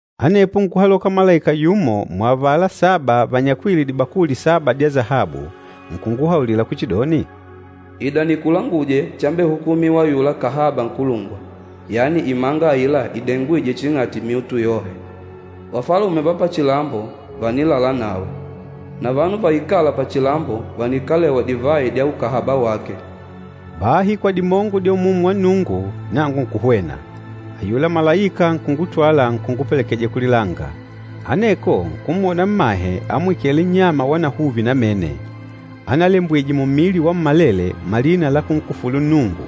Anepo nkuhaloka malaika yumo muavala saba vanyakwîle dibakuli saba dya sahabu, nkunguhaulila kuchidoni, “Ida nikulanguje chambehukumiwa ayula kahaba nkulungwa, yani imanga aila idengwîje ching'ati dihunde dyohe. Vafalume va pachilambo vànilala nawe, na vanu vaikâla pachilambo vànikalewa divayi dya ukahaba wake.” Bahi kwa dimongo dya Umumu wa Nnungu nangu nkuhwena, ayula malaika nkungutwala nkungupelekeja kulilanga. Aneko nkumwona mmahe amwikêle nnyama wanahuvi namene, analembwije mummili wammalele malina la kunkufulu Nnungu.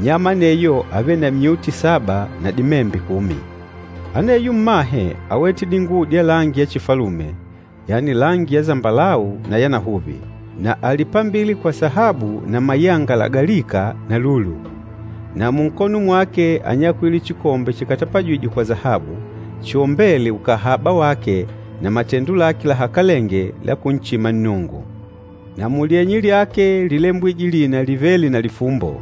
Nnyama aneyo ávele na myuti saba na dimembe kumi. Aneyo mmahe áwete dinguwo dya langi ya chifalume, yani langi ya sambalau na ya nahuvi, na álipambile kwa sahabu na mayanga lagalika na lulu. Na munkono mwake ányakwile chikombe chikatapajîjwe kwa sahabu, chiombêle ukahaba wake na matendo lake lahakalenge la kunchima Nnungu. Na mulyenye lyake lílembwije lina livêle na lifumbo,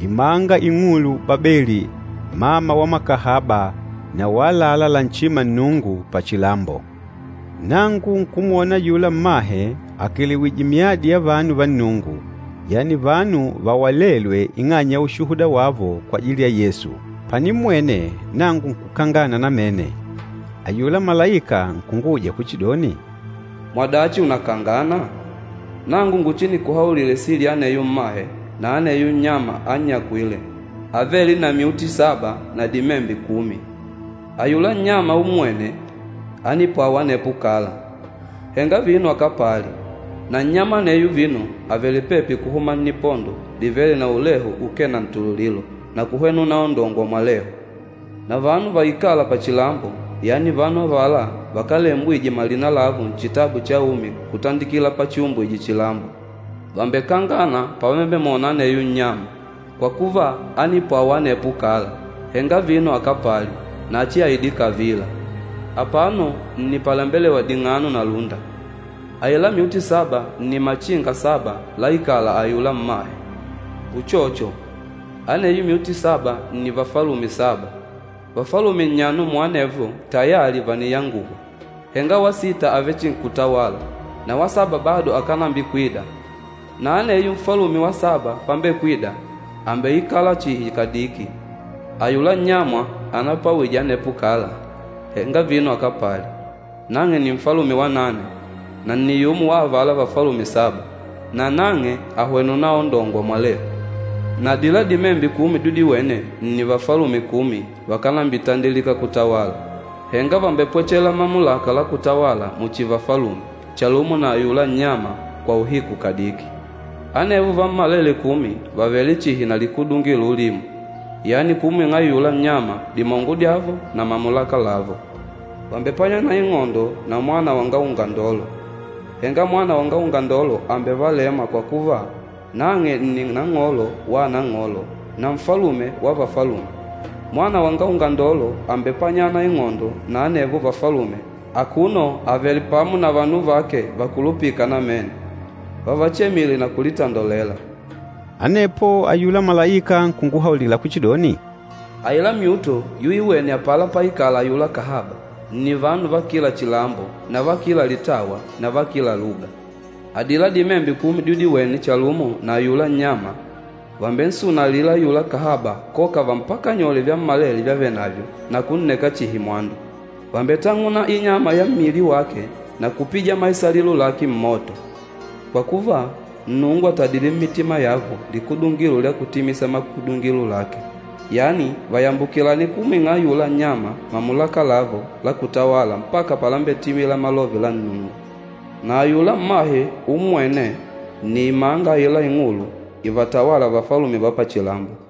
“IMANGA ING'ULU BABELI, MAMA WA MAKAHABA NA WA ÀLALÁ LANCHÎMA NNUNGU PACHILAMBO.” Nangu nkumwona ayula mmahe akelewìjè myadi ya vanu va Nnungu, yani vanu vawalêlwe ing'anya ya ushuhuda wavo kwajili ya Yesu. Panimmwene, nangu nkukangana namene. Ayula malaika nkunguuja kuchidoni, “Mwadachi unakangana? Nangu nguchinikuhaulile sili ya aneyo mmahe na ya aneyo nnyama annyakwîle, avêle na myuti saba na dimembe kumi. Ayula nnyama ummwêne, ánipwawa anepo kala, henga vino akapali. Na nnyama aneyo vino àvele pepi kuhuma nnipondo livêle na ulehu ukee na ntululilo na kuhwena unaondongwa mwalehu. Na vanu vaikâla pachilambo, yani vanu avala vakálembwijwe malina lavo Nchitabu cha Umi kutandikila pachiumbwije chilambo, vàmbekangana pavambemwona aneyo nnyama, kwa kuva, ánipwawa anepo kala, henga vino akapali, na achiaide kavila! Apano nni pàlembelewa ding'ano na lúnda. Aila myuti saba nni machinga saba láikàlà ayula mmahe. Uchocho, aneyo myuti saba nni vafalume saba. Vafalume nnyano muanevo tayali vàniyanguhwa, henga wa sita àvechinkutawala na wa saba bado akànambikwida. Na aneyo nfalume wa saba pambekwida, àmbeikala chihi kadiki. Ayula nnyama anapwawije anepo kala, henga vino akapali, nang'e nni nfalume wa nane, na nni yumo wa avala vafalume saba, nanang'e àhwena unaondongwa mwalehu. Na adila dimembe kumi dyudiwene nni vafalume kumi vakánambitandilika kutawala, henga vàmbepwechela mamulaka la kutawala muchi vafalume chalumo na ayula nnyama kwa uhiku kadiki. Anevo vammalele kumi vàvele chihi na likudungilo ulimo, yani kumwing'a ayula nnyama dimongo dyavo na mamulaka lavo. Vàmbepanyana ing'ondo na Mwana wanga Ungandolo, henga Mwana wanga Ungandolo àmbevalema kwa kuva, nang'e nni Nang'olo wa anang'olo na Nfalume wa vafalume. Mwana wanga Ungandolo àmbepanyana ing'ondo na anevo vafalume akuno avèlè pamo na vanu vake vakulupîka namene, vávachemìlè na kulitandolela.” Anepo ayula malaika nkunguhaulila kuchidoni, “Adila dihunde dyudiwene apala páikàlà ayula kahaba, nni vanu va kila chilambo na va kila litawa na va kila luga. Adila dimembe kumi dyudiwene chalumo na ayula nnyama, vàmbensunalila ayula kahaba koka vampakanyole vyammalele vyavenavyo na kunneka chihi mwandu. Vàmbetang'una inyama ya mmili wake na kupija maisalilo lake mmoto. Kwa kuva, Nnungu àtadile mmitima yavo likudungilo lya kutimisa makudungilo lake, yani vayambukilane kumwing'a ayula nnyama mamulaka lavo la kutawala mpaka palambetimila malove la Nnungu. Na ayula mmahe ummwêne, nni imanga aila ing'ulu ivatawâla vafalume va pachilambo.”